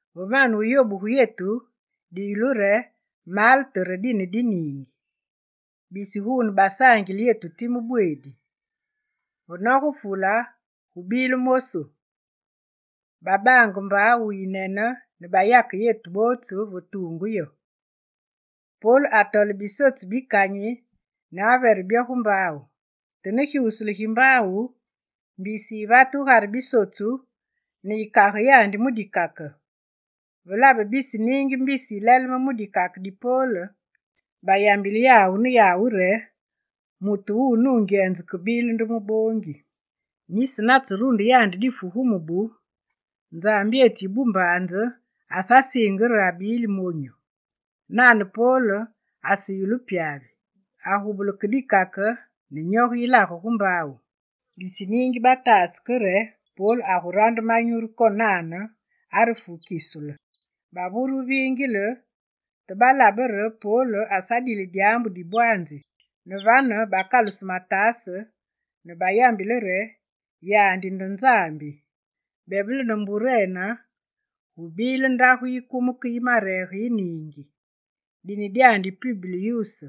Ve mane wuyobugu yetu, diyulu re Malte re dine di niingi. Bisi guune basaangile yetu time bweedi: ve nogenge fule gubile mosu, babaange mbaawu yiyinene ne bayake yetu bootsu va tuungu yo. Pol atole bisotsu bi kanyi ne avere byo gu mbaawu. Te ne gyusule gi mbaawu, mbisi yivate gugare bisotsu ne yikage yandi mu dikake. Ve labe bisi niingi mbisi yileleme mu dikake di Pol, bayambilenge yawu ne yawu re: «Mutu wuwu nungyenze kebile nde muboongi. Nisi natserunde yandi difu gu mubu, nzambyetu yi bumbaanze asasiinge re abili monyu.» Nane Pol aseyulu pyavi: agubule ke dikake re nyoge yilage gu mbaawu. Bisi niingi bataase ke re Pol agurande manyuru konane re agufu kisule. Bavure wuviingile, te balabe re Pol asadile dyaambu di bwaanzi, ne vane bakaluse mataase ne bayambile re: «Yandi nde nzambi!» Bebele ne mburene, gubile ndagu yi kumeke yi mareege yi niingi. Dine dyandi Publyuse.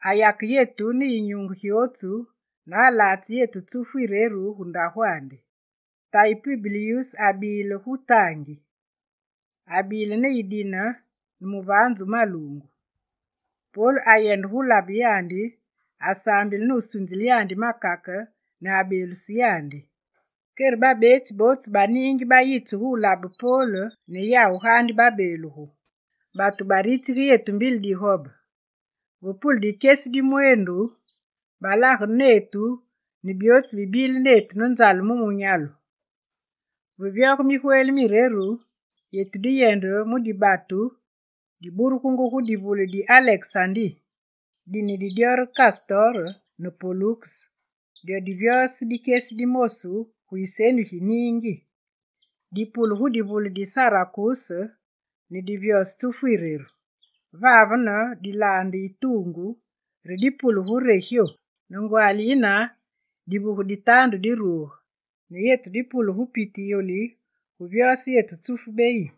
Ayake yetu ne yinyunge gyootsu ne alatse yetu tsufu yireru gu ndagwandi. Tayi Publyuse abile gu taangi, abile ne yidine ne muvaanzu wu maluungu. Pol ayende gu labe yandi, asaambile nusunzile yandi makake ne abeeluse yandi. Kere vane, babeetsi bootsu ba niingi bayitse gu wulabe Pol ne yawu gaandi babeelugu. Batu baritsige yetu mbili digobe. Ve pule dikyesi di mweendu, balagene netu ne byootsu bibile netu ne nzale mu munyalu. Ve vyoge migweli mireru, yetu diyende mu dibatu diburungu gu divule di Alekesandi. Dine di dyo re Kastor ne Poluks, dyo divyose dikyesi di mosu gu yiseni gi niingi. Dipule gudivule di Sirakuse ne divyose tsufu yireru. Vavene dilaande yi tuungu, re dipule gu Regyo. Ne ngwaali yine, divuge di taandu diruge ne yetu dipule gu Putiyoli va vyoge tsufu beyi.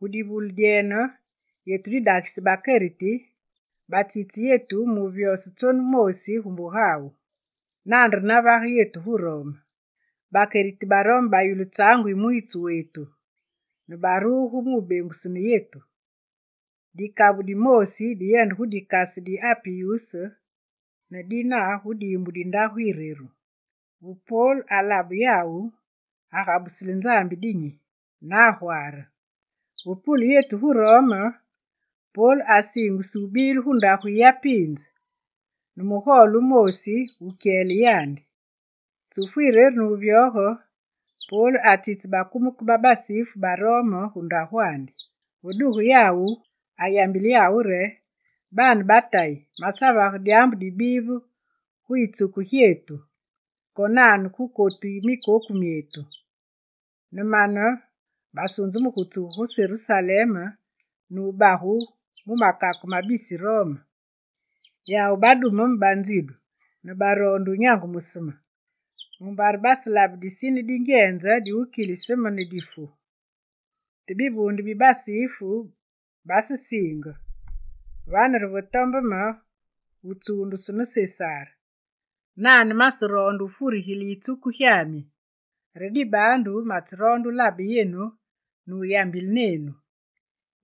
Gu divule dyene, yetu didagise bakeriti, batsitse yetu mu wuvyose tsonu moosi gu mbugawu. Nane re nayende yetu gu Rome. Bakeriti ba Rome bayulu tsaangu yi mwiitsu wetu, ne baruge mu wubengusunu yetu, dikabu dimoosi diyende gu Dikase di Apiyus ne dina gu diimbu di Ndagu Yireru. Ve Pol alabe yawu, agabusile Nzambi dinyi, ne agwaare. Ve pule yetu gu Rome, Pol asiingusu wubile gu ndagu yiyapiinze, ne mugole wumoosi wu wukyele yandi. Tsufu yireru ne wuvyoge, Pol atsitse bakumeke ba basifu ba Rome gu mbugandi. Ve duge yawu, ayambile yawu re: «Baane ba Tayi, masevage dyaambu dibive gu yitsuku gyetu, konane gu kotu yi mikoku myetu, ne mane masunzu gu tsugu gu Serusalem ne wugabu mu makake ma bisi Rome. Yawu badume me banzidu ne baroonde wunyangumuse me, mumbare baselabe disine dingyenze diwukilise me ne difu. Te bivuunde bi basifu basesiinge, vane re ve tombe me wutsuundusu ne Sesar. Nane maseroonde wufurigile yitsuku gyami. Re dibaandu matseroonde wulabe yenu ne wuyambile nenu.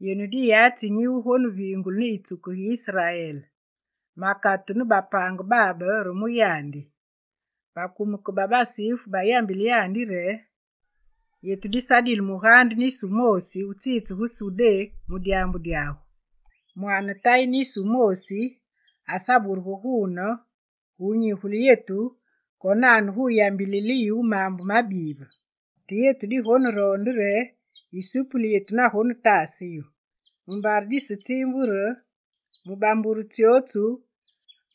Yenu diyatsi nyi wugoneviingulu ne yitsuku gi Israel, makatu ne bapaange babe re mu yandi.» Bakumeke ba basifu bayagule yandi re: «Yetu disadile mugaande nisi wumoosi wutsitse gu Sudé mu dyaambu dyagu, mwaane tayi nisi wumoosi asaburugu guune gu wunyigule yetu konane gu wuyambilile yu maambu mabive. Te yetu digoneroonde re yisupuli yetu magonetaase yu, mumbare disetsiimbu re mu bambure tsyootsu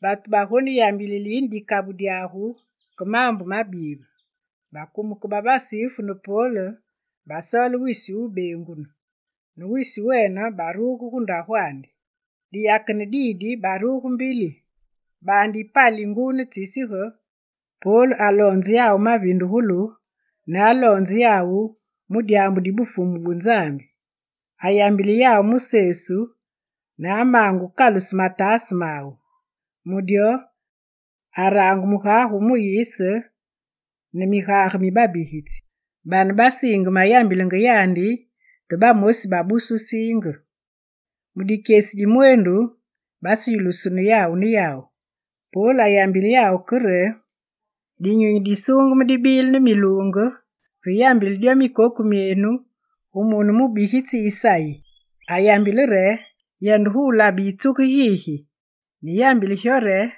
batu bagoneyambilile yine dikabu dyagu ke maambu mabive.» Bakumeke ba basifu ne Pol basoole wisi wubengunu, ne wisi wene baruge gu mbugandi. Diyakene didi, baruge mbili. Baande yipali nguu ne tsisige, Pol ayambile yawu mavindugulu, ne aloonze yawu ne mu dyaambu di Bufumu bu Nzambi. Ayambile yawu mu Sesu ne amaange wukaluse mataase mawu. Mu dyo araange mugage wu Muyise ne migaande mi babigitsi. Bane basiinge mayambilenge yandi, te bamosi babuse wusiinge. Mu dikyesi di mweendu, baseyulusunu yawu ne yawu. Pol ayambile yawu ke re: «Dinyunyi Disuungeme dibile ne miluunge ve yambile dyo mikoku myenu, gu mune wu mubigitsi Isayi! Ayambile re: “Yende gu labe yitsuku gigi, ne yambile gyo re: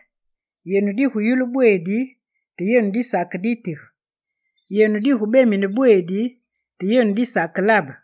Yenu diguyulu bweedi, te yenu disakeditige; yenu digubemine bweedi, te yenu disakelabe.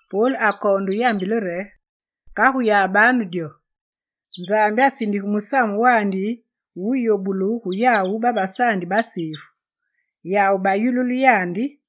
Pol akoonde wuyambile re: «Kagu yabanu dyo, Nzambi asindige Musamu Wumunyi wu wuyobulu gu yawu babasaandi basifu. Yawu baguyululu yandi!» [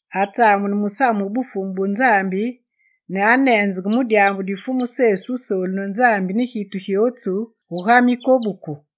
Atsamune musamu wu Bufumu bu Nzambi ne aneenzenge mu dyaambu di Fumu Sesu Wusoolu ne Nzambi ne gitu gyootsu, guga mikobuku.